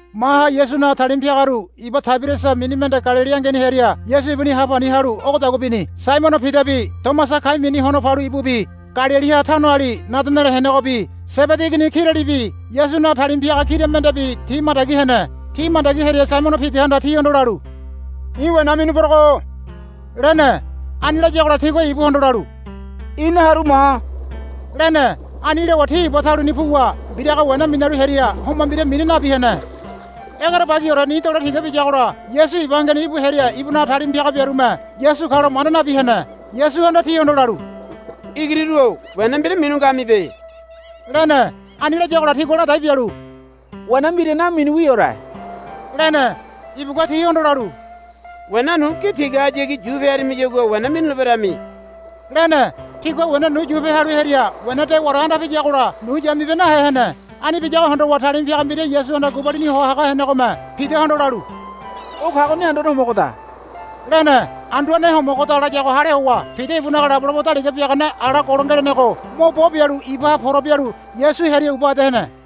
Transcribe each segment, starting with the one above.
Maha Yasunaga talima piagaru iba Taiberiasa mini mende Galili angeni hearia Yasu ibuni ha pani halu ogodagua bini. Saimono Pidabi Tomasa kai mini Hono Palu ibubi Galiliha Kaina tanoali Nadanele henegobi Sebedi igini kiralibi Yasunaga talima piaga kira mendebi ti mandagi hene. Ti mandagi hearia Saimono Pidahanda tihondo lalu, I̱ wena minu porogo, lene. Ani layagola tigua ibuhondo lalu, Ina haru ma, lene. Ani lowa ti iba taluni puwa mbiraga wena minalu hearia homa mbira mina nabi hene. Egerebagiore ni dole tiga biyagola Yasu iba angeni íbu hearia ibunaga talima piaga biarume Yasu kalo manda nabi hene. Yasuhanda tihondo lalu, Igiriru-o wena mbira minu ngamibe, lene. Ani layagola tigua ladai bialu, Wena mbira naminuwiore, lene. Ibugua tihondo lalu, Wena nu gi tigahayagi yupe harimiyagua wena minuleberami, lene. Tigua wena nu yupe halu hearia wena dewaore anda piyagola nu yamibe nahe hene. Ani biyago hondowa talima piaga mbira Yasuhanda gubalini ho haga henegome Pidahondo lalu, O kagoni Anduane Homogoda, lene. Anduane Homogoda layago hale howa Pida ibunaga labolabo daliga biagane ala golo ngelenego mo bo bialu ibaha pora bialu Yasu hearia uba ede hene.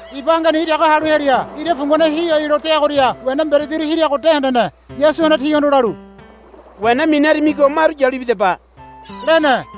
Iba angeni iraga halu hearia ira pungane hihoailo deagoria wena mberediru hiriago de hendene. Yasuhanda tihondo lalu, Wena minarimigo maru yalu ibidaba, lene.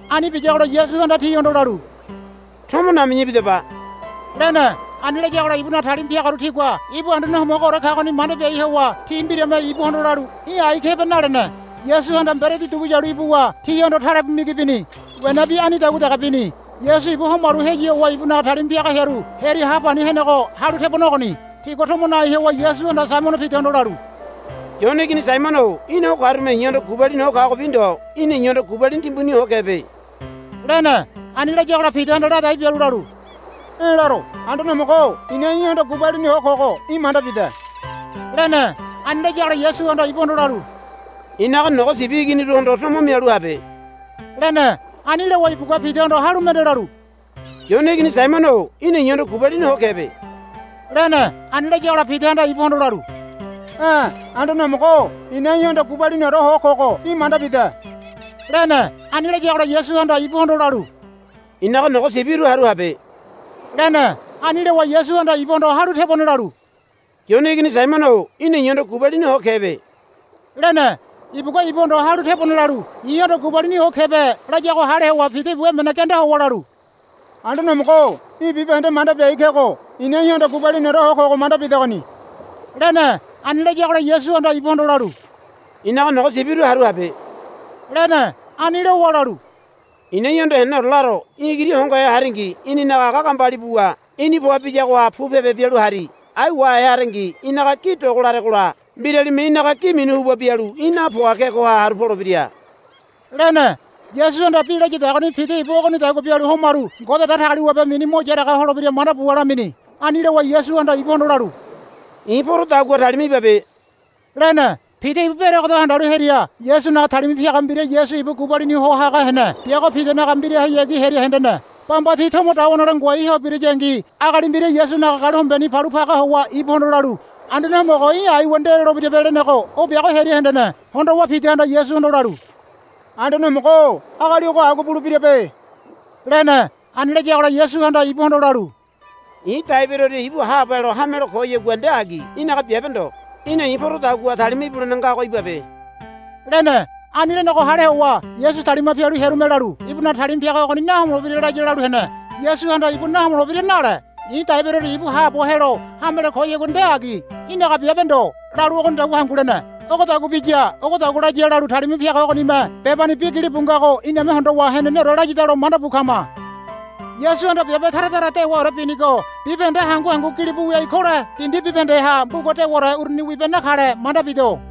Ani biyagola Yasuhanda tihondo lalu, Tomo nami̱ya ibidaba, lene. Ani layagola ibunaga talima piagaru tigua ibu Anduane Homogoore kagoni manda biai howa ti mbirame ibuhondo lalu, Í̠ ái kebe, nalene. Yasuhanda mberedi dugu yalu ibuwa tihondo talebu migi bini. Wenabi anidagua dege bini. Yasu ibu homalu heyu howa ibunaga talima piaga hearu hearia ha pani henego halu tebone ogoni. Tigua tomo nai howa Yasuhanda Saimono Pidahondo lalu, Yone igini Saimono-o í̠na o karume i̱hondo gubalini ho kagobi ndo í̠na i̱hondo gubalini timbuni ho kebe, lene. Ani layagola Pidahanda ladai bialu lalu, E̱ laro. Anduane Homogo-o i̱na í̠hondo gubalini ho kogo í̠ manda bide, lene. Ani layagola Yasuhanda ibuhondo lalu, I̱naga nogo sibi iginiruhondo tomo mialu habe, lene. Ani lowa ibugua Pidahondo halu mende lalu, Yone igini Saimono-o í̠na i̱hondo gubalini ho kebe, lene. Ani layagola Pidahanda ibuhondo lalu, E̱ Anduane Homogo-o i̱na í̠hondo gubaliniore ho kogo í̠ manda bide, lene. Ani layagola Yasuhanda ibuhondo lalu, I̱naga nogo sibiru haru habe, lene. Ani lowa Yasuhanda ibuhondo halu tebone lalu, Yone igini Saimono-o í̠na i̱hondo gubalini ho kebe, lene. Ibugua ibuhondo halu tebone lalu, I̱hondo gubalini ho kebe, layago hale howa Pida ibu emene genda howa lalu, Anduane Homogo-o í̠ bibahende manda biai kego i̱na í̠hondo gubaliniore ho kogo manda bidegoni, lene. Ani layagola Yasuhanda ibuhondo lalu, I̱naga nogo sibiru haru habe, lene. Ani lowa lalu, I̱na í̠hondo heneneore laro. Í̠ igiri hongohe haringi í̠ninaga aga gambali buwa í̠ni poa biyagoha pu pebe bialu hari. Ai í̠ wahe harengi í̠naga gi dogo laregola mbiralime í̠naga gi minu huba bialu í̠ napoa kegoha haru polebira, lene. Yasuhanda bi layadagoni Pida ibu ogonidagua bialu homalu Ngode Datagaliwabe mini mo yaraga holebira manda buwa lamini. Ani lowa Yasuhanda ibuhondo lalu, I̱ porodagua talima ibabe, lene. Pida ibu beregedo handalu hearia Yasunaga talima piaga mbira Yasu ibu gubalini ho haga hene biago Pidanaga mbirahayagi hearia hendene. Bamba ti tomo dawa nole ngoai ho birayangi agali mbira Yasunaga galu hombeni palu paga howa ibuhondo lalu, Anduane Homogo í̠ aiwa nde lolebirabe, lenego o biago hearia hendene. Hondowa Pidahanda Yasuhondo lalu, Anduane Homogo-o agali ogo agua bulebirabe, lene. Ani layagola Yasuhanda ibuhondo lalu, I̱ dai beroria ibu haabo helo hamelo koyagua nde agi. Í̠naga biabe ndo. Í̠na i̱ porodagua talima ibulene ngago ibabe, lene. Ani lenego hale howa Yasu talima pialu hearume lalu, Ibunaga talima piaga ogoni nahomolebira laya, lalu hene. Yasuhanda, Ibu nahomolebira, nale. I̱ dai beroria ibu haabo helo hamelo koyagua nde agi. Í̠naga biabe ndo, lalu ogonidagua hangu lene. Ogodagua biya ogodagua laya lalu talima piaga ogonime bebani bi gilibu ngago iname hondowa heneneore layadalo manda bu kama. Yasuhanda biabe tara tara dewaore binigo bibahende hangu hangu gilibu wiai kole dindi bibahendeha mbuga dewaore uruni wibe nakale manda bido.